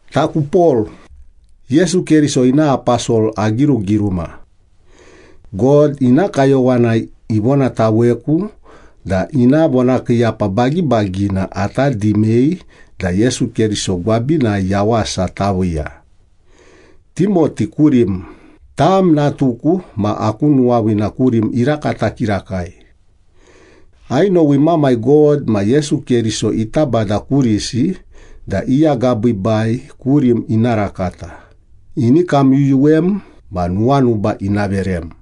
Taku Pol, Yesu Keriso ina aposol agirugiruma. God ina kayowanai ivonataweku da ina vonakiiyapa bagibagina ata dimei da Yesu Keriso gwabinai yawasa taviiya. Timoti kurim, tam natuku ma aku nuwaviina kurim irakata kirakai. Ainowi Mamai God ma Yesu Keriso ita Bada kurisi da i agabiibai kurim ina rakata, ini kamyuyuwem ma nuwanuba ina verem.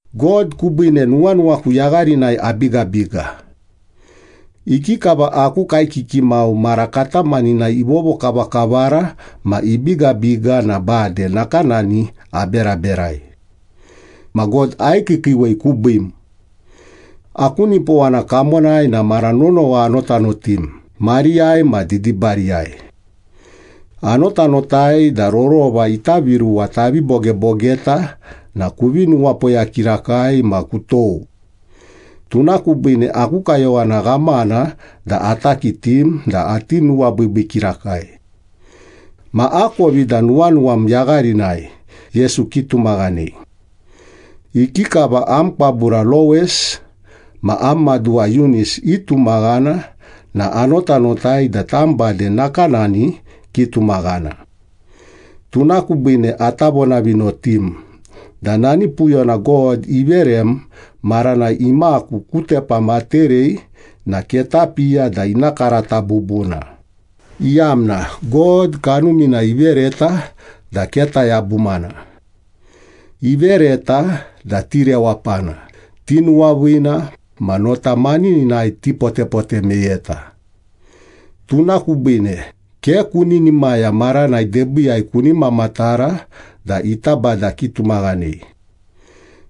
God kubiine nuwanuwaku yagharinai abigabiga. Ikikava aku kaekiki mau mara katamaninai ivovokavakavara ma ibigabiga na bade nakanani aberaberai. Ma God aikiikiiwei kubiim. Aku nipowana kamonai na mara nonowa anotanotim mariyai ma didibariyai. Anotanotai da rorova ita viruwa tavi bogebogeta na kuvi nuwapoya kirakai ma kutou. Tuna kubiine aku kayowana ghamana da ata kitim da ati nuwabiibii kirakai. Ma akovi da nuwanuwam yagharinai Yesu kitumaghanei. Ikikava am kwabura Lowis ma am maduwa Yunis itumaghana na anotanotai da tam bade nakanani kitumaghana. Tuna kubiine ata vonavinotim da nani puyona God iverem maranai imaku ku tepam aterei na ketapiya da ina karata bubuna, iyamna God Kanumina ivereta da ke tayabumana. Ivereta da tirewapana, tinuwaviina, ma nota manininai tipotepote meyeta. Tuna kubiine ke kuninimaya maranai debiiyai kuni mamatara da ita Bada kitumaghanei.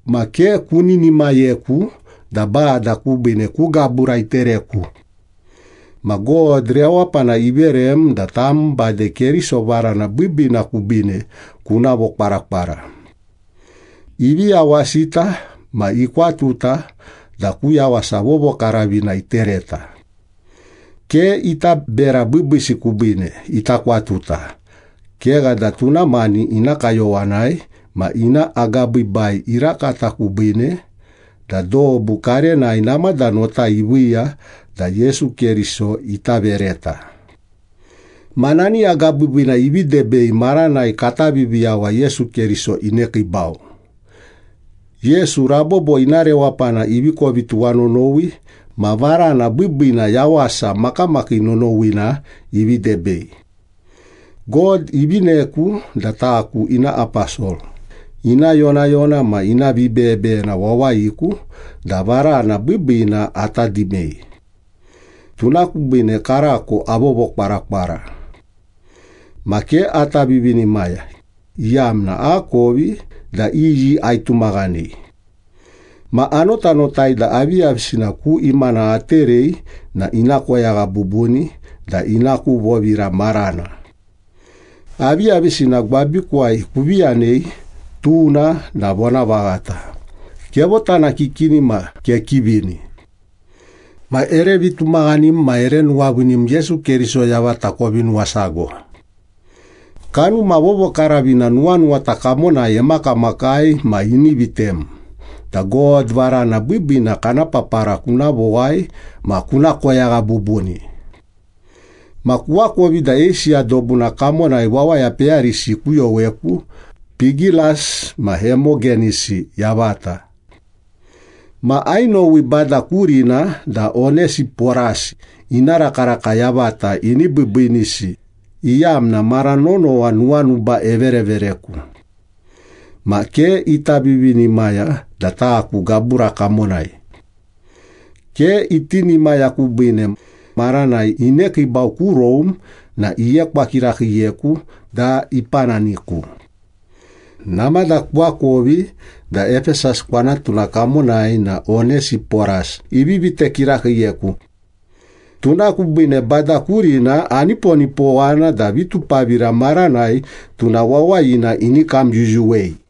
Ma ke kuninimayeku da Bada kubiine ku gabura itereku. Ma God rewapana iverem da tam bade Keriso varana biibiina kubiine kuna vokwarakwara. Ivi yawasita ma ikwatuta da ku yawasa vovokaravina itereta. Ke ita bera biibiisi kubiine ita kwatuta, kegha da tuna mani ina kayowanai ma ina agabiibai irakata kubiine, da dobu karenai namada nota iviiya da Yesu Keriso ita vereta. Ma nani agabiibiina ivi debei maranai kata Viviyawa Yesu Keriso inekiibau. Yesu rabobo ina rewapana ivi kovi tuwanonowi ma varana biibiinai yawasa makamakii nonowina ivi debei. God ivineku da taku ina aposol, ina yonayona ma ina vibeyebeyena wawayiku da varana biibiina ata dimei. Tuna kubiine karako avovokwarakwara. Ma ke ata vivinimaya, iyamna akovi da iyi aitumaghanei. Ma anotanotai da aviyavisina ku imana aterei na ina koyagha bubuni da ina ku vovira marana. Aviyavisina gwabikuwai kuvi yanei tuna na vonavaghata, kevotanakikini ma kekivini. Ma ere vitumaghanim ma ere nuwaviinim Yesu Keriso yavata kovi nuwasago. Kanuma Vovokaravina nuwanuwata kamonai emakamakai ma ini vitem da God varana biibiina kana papara kuna vowai ma kuna koyagha bubuni. Ma kuakovi da Eisiya dobuna kamonai wawaya peyarisi ikuyoweku, Pigelas ma Hemogenisi yavata. Ma ainowi Bada kurina da Onesiporas ina rakaraka yavata ini biibiinisi iyamna mara nonowa nuwanuba everevereku. Ma ke ita vivinimaya da taku gabura kamonai. Ke itinimaya kubiine, maranai inekiibau ku Rome na iekwa kirakiiyeku da ipananiku. Namada kuakovi da Epesas kwanatuna kamonai na Onesiporas ivi vite kirakiiyeku. Tuna kubiine Bada kurina aniponipowana da vitupavira maranai tuna wawayina ini kamyuyuwei.